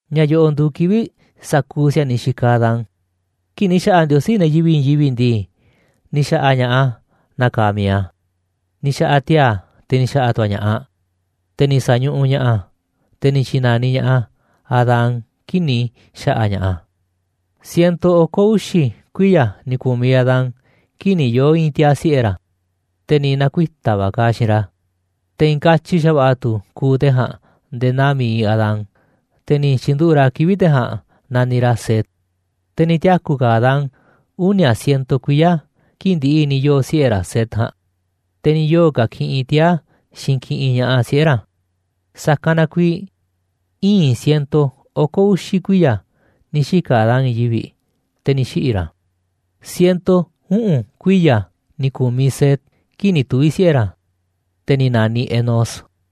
Ña̱ yo̱ꞌo̱ nduuꞌ kivi̱ꞌ sa̱kuuꞌ si̱a̱niꞌ xikaꞌ Adán. Kii̱ꞌ ni̱ xa̱ꞌa̱ Ndiosí ne̱ yivi̱ꞌ i̱i̱n yivi̱ꞌ ndii, ni̱ xa̱ꞌa̱ ña̱ꞌaꞌ a̱ naa kaaꞌ mi̱iꞌ a̱. Ni̱ xa̱ꞌa̱ a̱ tiaa̱, te̱ ni̱ xa̱ꞌa̱ tu̱ a̱ ña̱ꞌaꞌ, te̱ ni̱ sa̱ñuꞌuꞌ ña̱ꞌaꞌ a̱, te̱ ni̱ tyi̱na̱niꞌ ña̱ꞌaꞌ a̱ Adán kii̱ꞌ ni̱ xa̱ꞌa̱ ña̱ꞌaꞌ a̱. Ciento oko̱ uxi̱ kuiya̱ ni̱ ku̱miꞌ Adán kii̱ꞌ ni̱ yoo̱ i̱i̱n tiaa̱ siꞌe̱ ra̱, te̱ ni̱ na̱kuita̱ va̱ kaaꞌ xiinꞌ ra̱, te̱ i̱i̱n katyi xa̱va̱ꞌa̱ tu̱ kuuꞌ te̱ ja̱a̱nꞌ nde̱e̱ naa mi̱iꞌ Adán, te̱ ni̱ tyi̱nduꞌu̱ꞌ ra̱ kivi̱ꞌ te̱ ja̱a̱nꞌ naniꞌ ra̱ Set. Te̱ ni̱ tiaku̱ ka̱ Adán uni̱a̱ ciento kuiya̱ kii̱ꞌ ndi̱ꞌi̱ ni̱ yoo̱ siꞌe̱ ra̱ Set ja̱a̱nꞌ, te̱ ni̱ yoo̱ ka̱ kiꞌinꞌ tiaa̱ xiinꞌ kiꞌinꞌ ña̱ꞌaꞌ siꞌe̱ ra̱. Sa̱kanꞌ na kuiiꞌ ii̱n ciento oko̱ uxi̱ kuiya̱ ni̱ xika̱ Adán i̱i̱n yivi̱ꞌ, te̱ ni̱ xiꞌi̱ ra̱. Ciento uꞌu̱n kuiya̱ ni̱ ku̱miꞌ Set kii̱ꞌ ni̱ tuvi̱ siꞌe̱ ra̱, te̱ ni̱ na̱niꞌ Enós.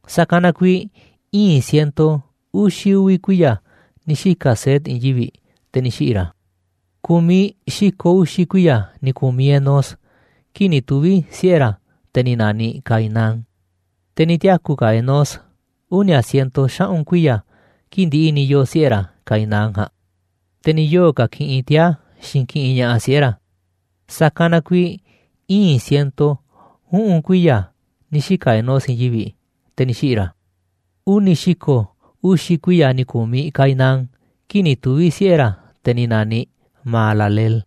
Sa̱kanꞌ na kuiiꞌ ii̱n ciento uxi̱ uvi̱ kuiya̱ ni̱ xika̱ Set i̱i̱n yivi̱ꞌ, te̱ ni̱ xiꞌi̱ ra̱. Ku̱miꞌ xi̱ko̱ uxi̱ kuiya̱ ni̱ ku̱miꞌ Enós kii̱ꞌ ni̱ tuvi̱ siꞌe̱ ra̱, te̱ ni̱ na̱niꞌ Cainán. Te̱ ni̱ tiaku̱ ka̱ Enós uni̱a̱ ciento xaꞌu̱n kuiya̱ kii̱ꞌ ndi̱ꞌi̱ ni̱ yoo̱ siꞌe̱ ra̱ Cainán ja̱a̱nꞌ, te̱ ni̱ yoo̱ ka̱ kiꞌinꞌ tiaa̱ xiinꞌ kiꞌinꞌ ña̱ꞌaꞌ siꞌe̱ ra̱. Sa̱kanꞌ na kuiiꞌ ii̱n ciento uꞌu̱n kuiya̱ ni̱ xika̱ Enós i̱i̱n yivi̱ꞌ, te̱ ni̱ xiꞌi̱ ra̱. Uni̱ xi̱ko̱ uxi̱ kuiya̱ ni̱ ku̱miꞌ Cainán kii̱ꞌ ni̱ tuvi̱ siꞌe̱ ra̱, te̱ ni̱ na̱niꞌ Mahalaleel.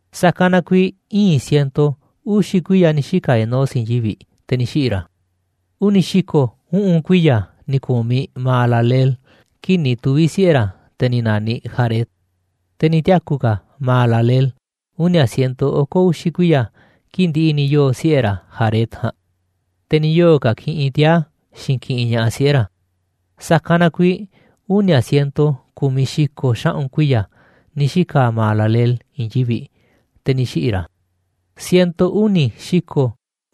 Sa̱kanꞌ na kuiiꞌ ii̱n ciento uxi̱ kuiya̱ ni̱ xika̱ Enós i̱i̱n yivi̱ꞌ, te̱ ni̱ xiꞌi̱ ra̱. Uni̱ xi̱ko̱ uꞌu̱n kuiya̱ ni̱ ku̱miꞌ Mahalaleel kii̱ꞌ ni̱ tuvi̱ siꞌe̱ ra̱, te̱ ni̱ na̱niꞌ Jared. Te̱ ni̱ tiaku̱ ka̱ Mahalaleel uni̱a̱ ciento oko̱ uxi̱ kuiya̱ kii̱ꞌ ndi̱ꞌi̱ ni̱ yoo̱ siꞌe̱ ra̱ Jared ja̱a̱nꞌ, te̱ ni̱ yoo̱ ka̱ kiꞌinꞌ tiaa̱ xiinꞌ kiꞌinꞌ ña̱ꞌaꞌ siꞌe̱ ra̱. Sa̱kanꞌ na kuiiꞌ uni̱a̱ ciento ku̱miꞌ xi̱ko̱ xaꞌu̱n kuiya̱ ni̱ xika̱ Mahalaleel i̱i̱n yivi̱ꞌ, te̱ ni̱ xiꞌi̱ ra̱. Ciento uni̱ xi̱ko̱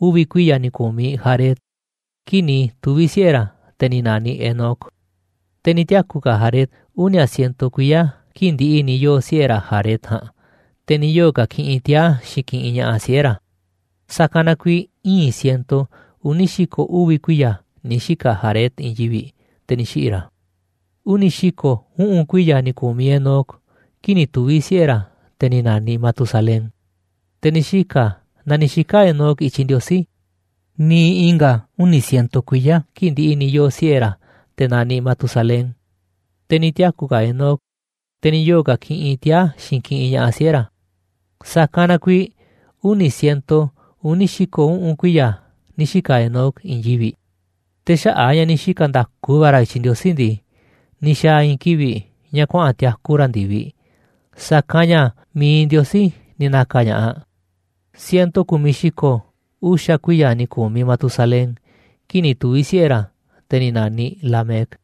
uvi̱ kuiya̱ ni̱ ku̱miꞌ Jared kii̱ꞌ ni̱ tuvi̱ siꞌe̱ ra̱, te̱ ni̱ na̱niꞌ Enoc. Te̱ ni̱ tiaku̱ ka̱ Jared uni̱a̱ ciento kuiya̱ kii̱ꞌ ndi̱ꞌi̱ ni̱ yoo̱ siꞌe̱ ra̱ Jared ja̱a̱nꞌ, te̱ ni̱ yoo̱ ka̱ kiꞌinꞌ tiaa̱ xiinꞌ kiꞌinꞌ ña̱ꞌaꞌ siꞌe̱ ra̱. Sa̱kanꞌ na kuiiꞌ ii̱n ciento uni̱ xi̱ko̱ uvi̱ kuiya̱ ni̱ xika̱ Jared i̱i̱n yivi̱ꞌ, te̱ ni̱ xiꞌi̱ ra̱. Uni̱ xi̱ko̱ uꞌu̱n kuiya̱ ni̱ ku̱miꞌ Enoc kii̱ꞌ ni̱ tuvi̱ siꞌe̱ ra̱, te̱ ni̱ na̱niꞌ Matusalén. Te̱ ni̱ xika̱ naa ni̱ xika̱ Enoc i̱tyiꞌ Ndiosí niiꞌ i̱nga̱ uni̱ ciento kuiya̱ kii̱ꞌ ndi̱ꞌi̱ ni̱ yoo̱ siꞌe̱ ra̱, te̱ naniꞌ Matusalén, te̱ ni̱ tiaku̱ ka̱ Enoc, te̱ ni̱ yoo̱ ka̱ kiꞌinꞌ tiaa̱, xiinꞌ kiꞌinꞌ ña̱ꞌaꞌ siꞌe̱ ra̱. Sa̱kanꞌ na kuiiꞌ uni̱ ciento uni̱ xi̱ko̱ uꞌu̱n kuiya̱ ni̱ xika̱ Enoc i̱i̱n yivi̱ꞌ. Te̱ xaꞌa̱ꞌ a̱ ña̱ ni̱ xika̱ nda̱ku va̱ ra̱ i̱tyiꞌ Ndiosí ndii, ni̱ xa̱a̱ i̱i̱n kivi̱ꞌ ña̱ kuaꞌa̱n tiaku ra̱ ndi̱viꞌ, sa̱kanꞌ ña̱ mi̱iꞌ Ndiosí ni̱ na̱ka̱ ña̱ꞌaꞌ. Ciento ku̱miꞌ xi̱ko̱ uxa̱ kuiya̱ ni̱ ku̱miꞌ Matusalén kii̱ꞌ ni̱ tuvi̱ siꞌe̱ ra̱, te̱ ni̱ na̱niꞌ Lamec.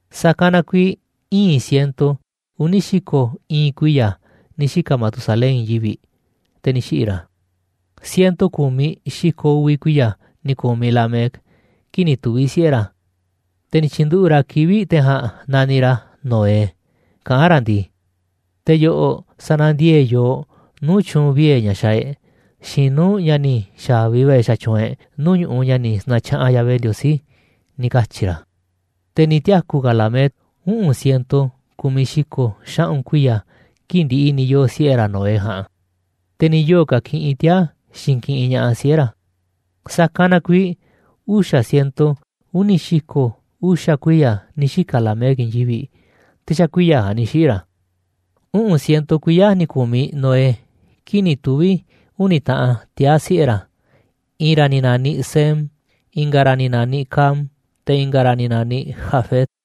Sa̱kanꞌ na kuiiꞌ ii̱n ciento uni̱ xi̱ko̱ ii̱n kuiya̱ ni̱ xika̱ Matusalén i̱i̱n yivi̱ꞌ, te̱ ni̱ xiꞌi̱ ra̱. Ciento ku̱miꞌ xi̱ko̱ uvi̱ kuiya̱ ni̱ ku̱miꞌ Lamec kii̱ꞌ ni̱ tuvi̱ siꞌe̱ ra̱, te̱ ni̱ tyi̱nduꞌu̱ꞌ ra̱ kivi̱ꞌ te̱ ja̱a̱nꞌ naniꞌ ra̱ Noé, kaꞌán ra̱ ndii: ―Te̱ yo̱ꞌo̱ sa̱na̱ndiee̱ꞌ yooꞌ nuu̱ꞌ tyu̱u̱n vie̱ ña̱ xaaꞌ e̱ꞌ xiinꞌ nuu̱ꞌ ña̱ ni̱ xa̱vi va̱ e̱ꞌ xatyuunꞌ e̱ꞌ nuu̱ꞌ ñu̱ꞌuꞌ ña̱ ni̱ sa̱na̱tyaꞌanꞌ Yahvé Ndiosí ―ni̱ katyi̱ ra̱. Te̱ ni̱ tiaku̱ ka̱ Lamec, uꞌu̱n ciento ku̱miꞌ xi̱ko̱ xaꞌu̱n kuiya̱ kii̱ꞌ ndi̱ꞌi̱ ni̱ yoo̱ siꞌe̱ ra̱ Noé ja̱a̱nꞌ, te̱ ni̱ yoo̱ ka̱ kiꞌinꞌ tiaa̱, xiinꞌ kiꞌinꞌ ña̱ꞌaꞌ siꞌe̱ ra̱. Sa̱kanꞌ na kuiiꞌ uxa̱ ciento uni̱ xi̱ko̱ uxa̱ kuiya̱ ni̱ xika̱ Lamec i̱i̱n yivi̱ꞌ, te̱ xa̱ kuiya̱ ja̱a̱nꞌ ni̱ xiꞌi̱ ra̱. Uꞌu̱n ciento kuiya̱ ni̱ ku̱miꞌ Noé kii̱ꞌ ni̱ tuvi̱ uni̱ taꞌan tiaa̱ siꞌe̱ ra̱: I̱i̱n ra̱ ni̱ na̱niꞌ Sem, i̱nga̱ ra̱ ni̱ na̱niꞌ Cam, te̱ i̱nga̱ ra̱ ni̱ na̱niꞌ Jafet.